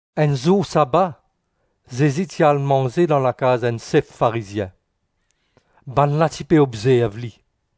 Enn zour saba, Zezi ti al manze dan lakaz enn sef Farizien. Bannla ti pe obzerv li.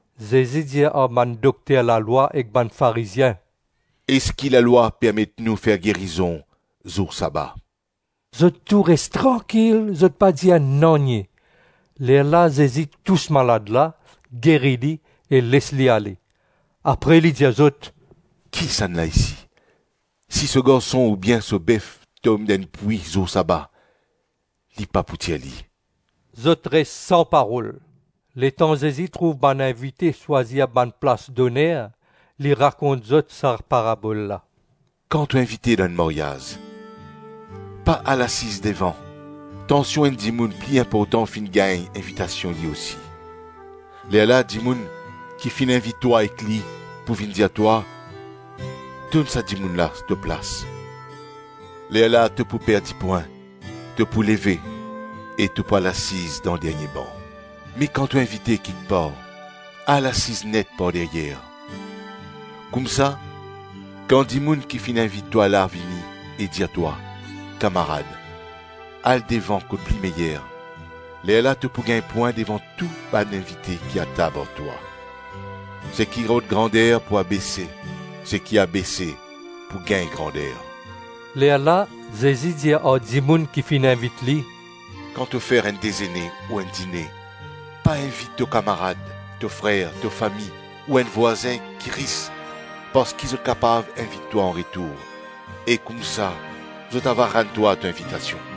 Zezi dir ar bann dokter lalwa ek bann Farizien, “Eski lalwa permet nou fer gerizon zour saba?” Zot tou res trankil, zot pa dir nanye. Lerla Zezi tous malad la, geri li, e les li ale. Apre li dir zot, “Kisannla isi, si so garson oubien so bef tom dan enn pwi zour saba, li pa pou tir li?” Zot res san parol. Letan Zezi trouv bann invite swazir bann plas doner, li rakont zot sa parabol la, “Kan to invite dan enn maryaz, pa al asiz devan, tansion enn dimoun pli inportan finn gagn invitasion li osi; lerla dimoun ki finn invit twa ek li, pou vinn dir twa, ‘Donn sa dimoun la to plas.’ Lerla to pou perdi pwin, to pou leve e to pou al asiz dan dernie ban. Me kan to invite kikpar, al asiz net par deryer; koumsa, kan dimoun ki finn invit twa la vini e dir twa, ‘Kamarad, al devan kot pli meyer.’ Lerla to pou gagn pwin devan tou bann invite ki atab ar twa. Seki rod grander pou abese, seki abese pou gagn grander.” Lerla Zezi dir ar dimoun ki finn invit li, “Kan to fer enn dezene ou enn dine, pa invit to kamarad, to frer, to fami ou enn vwazin ki ris, parski zot kapav invit twa anretour e koumsa zot ava rann twa to invitasion.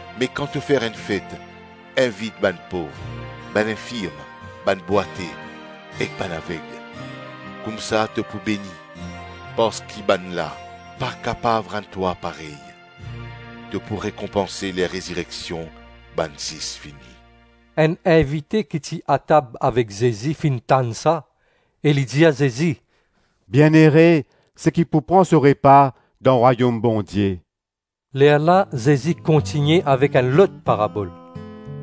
Me kan to fer enn fet invit bann pov, bann infirm, bann bwate ek bann aveg, koumsa to pou beni, parski bannla pa kapav rann twa parey. To pou rekonpanse ler rezireksion bann zis vini.” Enn invite ki ti atab avek Zezi finn tann sa e li dir Zezi, “Bienere seki pou pran so repa dan Rwayom Bondie.” Lerla Zezi kontigne avek enn lot parabol,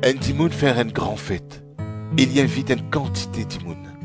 “Enn dimoun fer enn gran fet, e li invit enn kantite dimoun.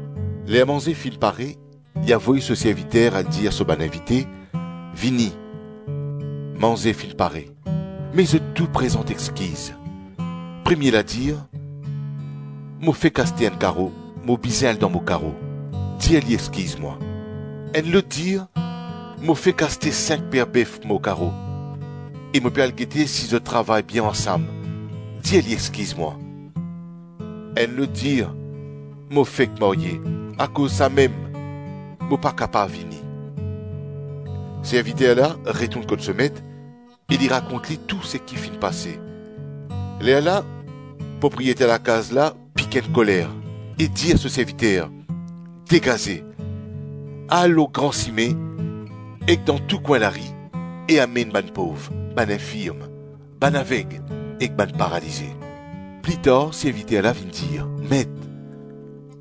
Ler manze finn pare, li avoy so serviter al dir so bann invite, ‘Vini, manze finn pare.’ Me zot tou prezant exkiz. Premie la dir, ‘Mo fek aste enn karo, mo bizin al dan mo karo. Dir li exkiz mwa.’ Enn lot dir, ‘Mo fek aste sink per bef pou mo karo, e mo pe al gete si zot travay bien ansam. Dir li exkiz mwa.’ Enn lot dir, ‘Mo fek marye, akoz samem mo pa kapav vini.’ Serviter la retourn kot so met e li rakont li tou seki finn pase. Lerla propriyeter lakaz la pik enn koler e dir so serviter, ‘Degaze, al lor gran sime ek dan tou kwin lari e amenn bann pov, bann infirm, bann aveg ek bann paralize.’ Plitar serviter la vinn dir, ‘Met,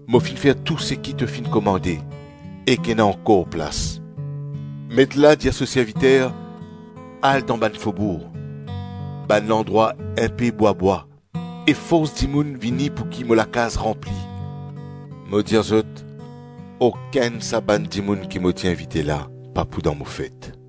mo finn fer tou seki to finn komande, ek ena ankor plas.’ Met la dir so serviter, ‘Al dan bann fobour, bann landrwa inpe bwa-bwa e fors dimoun vini pouki mo lakaz ranpli. Mo dir zot, okenn sa bann dimoun ki mo ti invite la pa pou dan mo fet.’”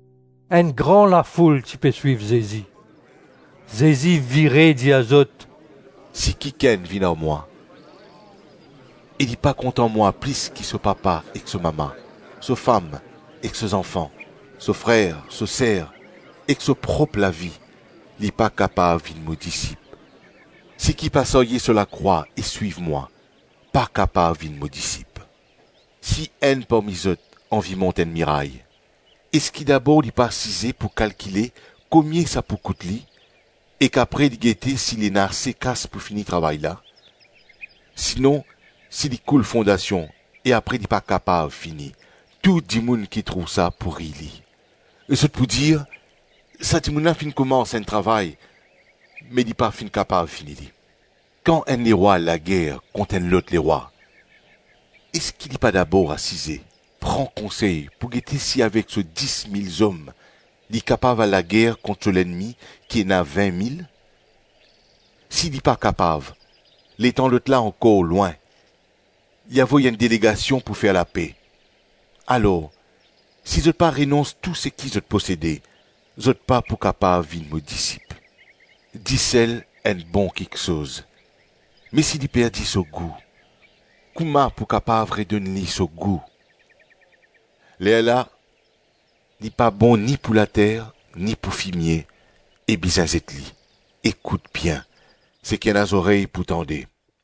Enn gran lafoul ti pe swiv Zezi. Zezi vire, dir zot, “Si kikenn vinn ar mwa e li pa kontan mwa plis ki so papa ek so mama, so fam ek so zanfan, so frer, so ser, ek so prop lavi, li pa kapav vinn mo disip. Seki pa sarye so lakrwa e swiv mwa, pa kapav vinn mo disip. Si enn parmi zot anvi mont enn miray, eski dabor li pa asize pou kalkile komie sa pou kout li, ek apre li gete si li ena ase kas pou fini travay la? Sinon, si li koul fondasion e apre li pa kapav fini, tou dimoun ki trouv sa pou riy li. Zot pou dir, ‘Sa dimoun la finn koumans enn travay me li pa finn kapav fini li.’ Kan enn lerwa al lager kont enn lot lerwa, eski li pa dabor asize, pran konsey pou gete si avek so dis mil zom li kapav al lager kont so lennmi ki ena vin-mil? Si li pa kapav, letan lotla ankor lwin, li avoy enn delegasion pou fer lape. Alors, si zot pa renons tou seki zot posede, zot pa pou kapav vinn mo disip. Disel enn bon kiksoz; me si li perdi so gou, kouma pou kapav redonn li so gou? Lerla li pa bon ni pou later, ni pou fimie e bizin zet li. Ekout bien, seki ena zorey pou tande.